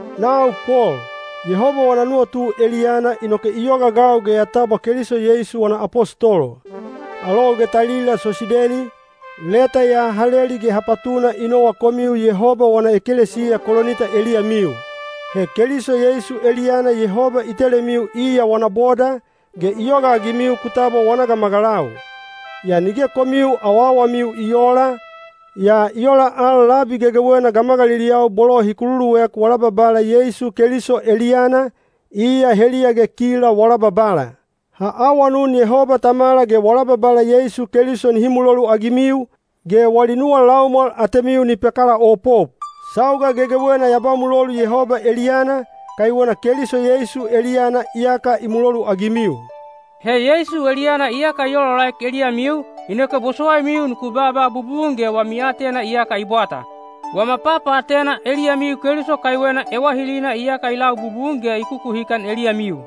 Nau Pol, Yehoba wana nuwatu eliyana inoke i yogaagau ge ya tabwa Keliso Yeisu wana apostolo. Alou ge talila Sosideni, leta ya ha leli ge ha patuna i nowa komiu Yehoba wana ekelesiya Kolinita eliyamiu. He Keliso Yeisu eliyana Yehoba i telemiu iya wana boda, ge i yogaagimiu ku tabwa wana gamagalau. Yaa nige komiu awawamiu i oola, yaa i ola al labi gegewena gamagaliliyau bolo hi kululuek wala Babala Yeisu Keliso eliyana, iya heliya ge kila wala Babala. Ha awanun Yehoba Tamala ge wala Babala Yeisu Keliso nihi muloluagimiu, ge wali nuwa laumwal atemiu ni pakalaopop. Sauga gegewena ya ba mulolu Yehoba eliyana, kaiwena Keliso Yeisu eliyana iyaka i muloluagimiu. He Yeisu eliyana iyaka i olaolaek eliyamiu, inoke bosowaimiu nuku baaba bubun ge wami aatena iyaka i bwata. Wama papaatena eliyamiu Keliso kaiwena ewahilina iyaka i lau bubun ge i kukuhikan eliyamiu.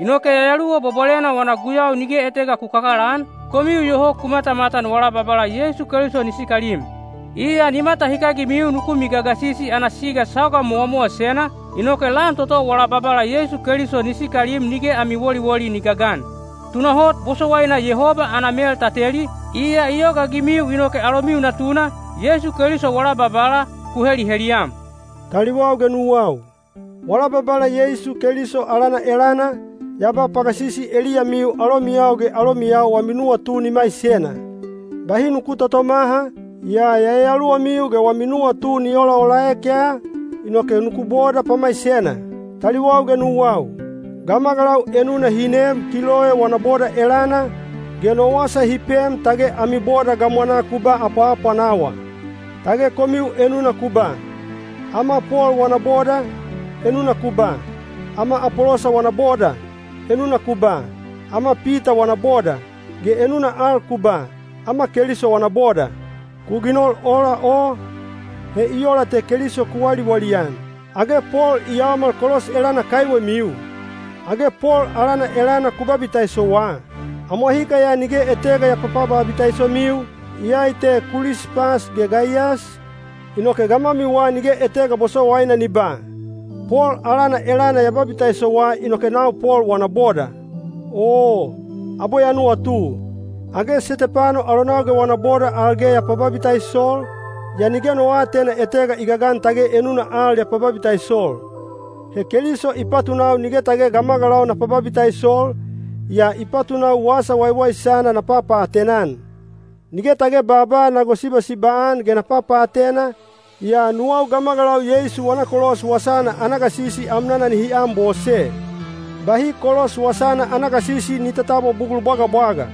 Inoke Yayaluwa Bwabwalena wana guyau nige etega ku kakalaan, komiu iyoho ku matamatan wala Babala Yeisu Keliso ni sikalim. Iya ni matahikagimiu nuku migagasisi ana siga sauga mowamowasena, inoke lan toto wala Babala Yeisu Keliso ni sikalim nige ami woliwoli ni gagan. Tunahot bosowaina Yehoba ana mel ta teli, iya i yogaagimiu inoke alomiu Natuna, Yeisu Keliso wala Babala, ku heliheliyam. Taliwau ge nuwau, wala Babala Yeisu Keliso alana elana, ya ba pagasisi eliyamiu alomiyau ge alomiyau wami nuwatu ni maisena. Bahi nuku totomaha, yaa yayaluwamiu ge wami nuwatu ni olaolaek ya, inoke nuku boda pamaisena. Taliwau ge nuwau, gamagalau enuna hi neem Kiloe wana boda elana, ge no wasa hi pem tage ami boda gamwanaa ku ba apwaapwanawa. Tage komiu enuna ku ba, “Ama Pol wana boda”; enuna ku ba, “Ama Apolosa wana boda”; enuna ku ba, “Ama Pita wana boda”; ge enuna al ku ba, “Ama Keliso wana boda.” Ku ginol ola o, he i ola te Keliso ku waliwali-an. Age Pol i yaomal kolos elana kaiwemiu? Age Pol alana elana ku babitaisowa? Amwahika ya nige etega ya papababitaisomiu, iyai te Kulispas ge Gaiyas, inoke gamwamiwa nige etega bosowaina ni ba, “Pol alana elana ya babitaisowa inoke nau Pol wana boda.” (Oo, abwe ya nuwatu, age Setepano alonau ge wana boda al ge ya pababitaisol, yaa nige no aatena etega i gagan tage enuna al ya pababitaisol.) He Keliso i patunau nige tage gamagalau na pababitaisol, yaa i patunau Wasa Waiwaisana na papaatena-an. Nige tage baaba na gosibasiba-an ge na papaatena, yaa nuwau gamagalau Yeisu wana kolos wasana ana gasisi amnana nihi anbose. Bahi kolos wasana ana gasisi ni tatabwa bugul bwagabwaga.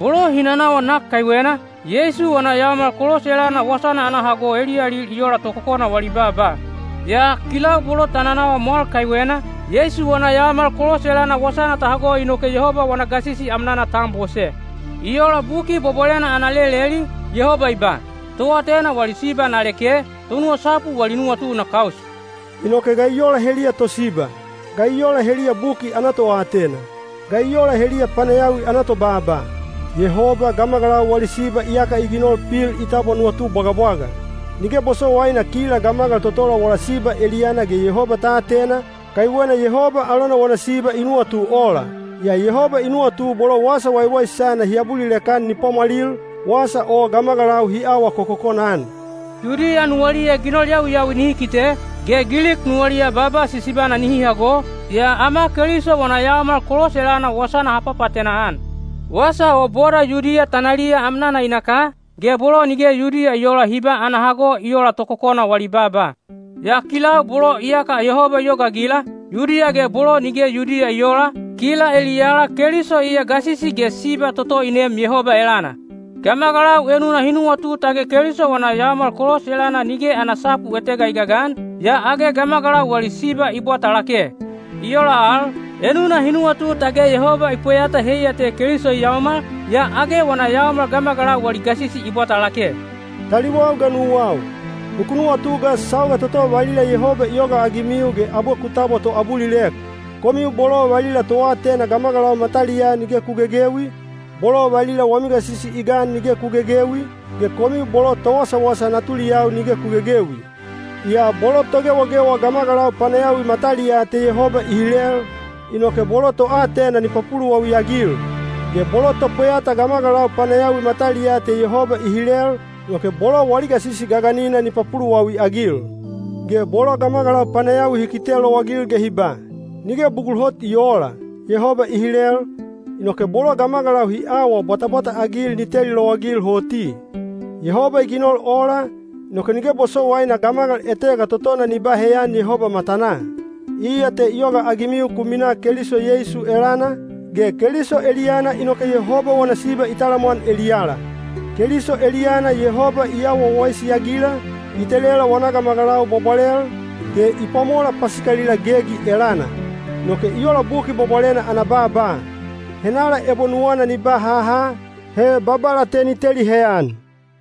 Bolo hi nanawa nak kaiwena, Yeisu wana yaomal kolos elana wasana ana hago eliyalil i ola tokokona wali baaba. Yaa kilau bolo ta nanawa mwal kaiwena, Yeisu wana yaomal kolos elana wasana ta hago inoke Yehoba wana gasisi amnana ta anbose. I ola Buki Bwabwalena ana leleli, Yehoba i ba: “Toatena wali siba na leke, tonuwasapu wali nuwatu na kaus.” Inoke ga i ola heliya tosiba? Ga i ola heliya buki ana toatena? Ga i ola heliya panayawi ana tobaaba? Yehoba gamagalau wali siba iyaka i ginol pil i tabwa nuwatu bwagabwaga. Nige bosowaina kila gamagal totola wala siba eliyana ge Yehoba ta atena, kaiwena Yehoba alona wana siba i nuwatu ola. Yaa Yehoba i nuwatu bolo Wasa Waiwaisana hi abulilek-an ni pwamwalil, wasa o gamagalau hi awa kokokona-an. Yudiya nuwaliya ginol yawiyawi nihi kite, ge Gilik nuwaliya baaba sisibana nihi hago, yaa ama Keliso wana yaomal kolos elana wasana ha papaatena-an. Wasa o boda Yudiya tanaliya amnana i naka, ge bolo nige Yudiya i oola hi ba ana hago i ola tokokona wali baaba. Yaa kilau bolo iyaka Yehoba i yogaagila, Yudiya ge bolo nige Yudiya i oola, kila eliyala Keliso iya gasisi ge siba toto i neem Yehoba elana. Gamagalau enuna hi nuwatu tage Keliso wana yaomal kolos elana nige ana sapu etega i gagan, yaa age gamagalau wali siba i bwata lake. I ola al, enuna hi nuwatu tage Yehoba i pweyata heiya te Keliso i yaomal, yaa age wana yaomal gamagalau wali gasisi i bwata lake. Taliwau ge nuwau, nuku nuwatu ga sauga toto valila Yehoba i yogaagimiu ge abwe ku tabwa toabulilek. Komiu bolo valila toatena gamagalau mataliyaa nige ku gegewi, bolo valila wami gasisi i gan nige ku gegewi, ge komiu bolo towasawasa natuliyau nige ku gegewi. Yaa bolo togewagewa gamagalau panayawi mataliyaa te Yehoba i hilel, inoke bolo toatena ni papuluwawi-agil. Ge bolo topweyata gamagalau panayawi mataliyaa te Yehoba i hilel, inoke bolo wali gasisi gaganina ni papuluwawi-agil. Ge bolo gamagalau panayawi hi kite lowagil ge hi ba, “Nige bugul hot i oola,” Yehoba i hilel, inoke bolo gamagalau hi awa bwatabwata-agil ni teli lowagil hoti. Yehoba i ginol ola, inoke nige bosowaina gamagal etega totona ni ba heyan Yehoba matanaa. Iya te i yogaagimiu ku minaa Keliso Yeisu elana, ge Keliso eliyana inoke Yehoba wana siba i talamwan eliyala. Keliso eliyana Yehoba i awa wawaisi-agila, i telela wana gamagalau bwabwalel, ge i pwamola pasikalila gegi elana. Inoke i ola Buki Bwabwalena ana baaba: “Henala ebo nuwana ni ba haha, he Babala te ni teli heyan.”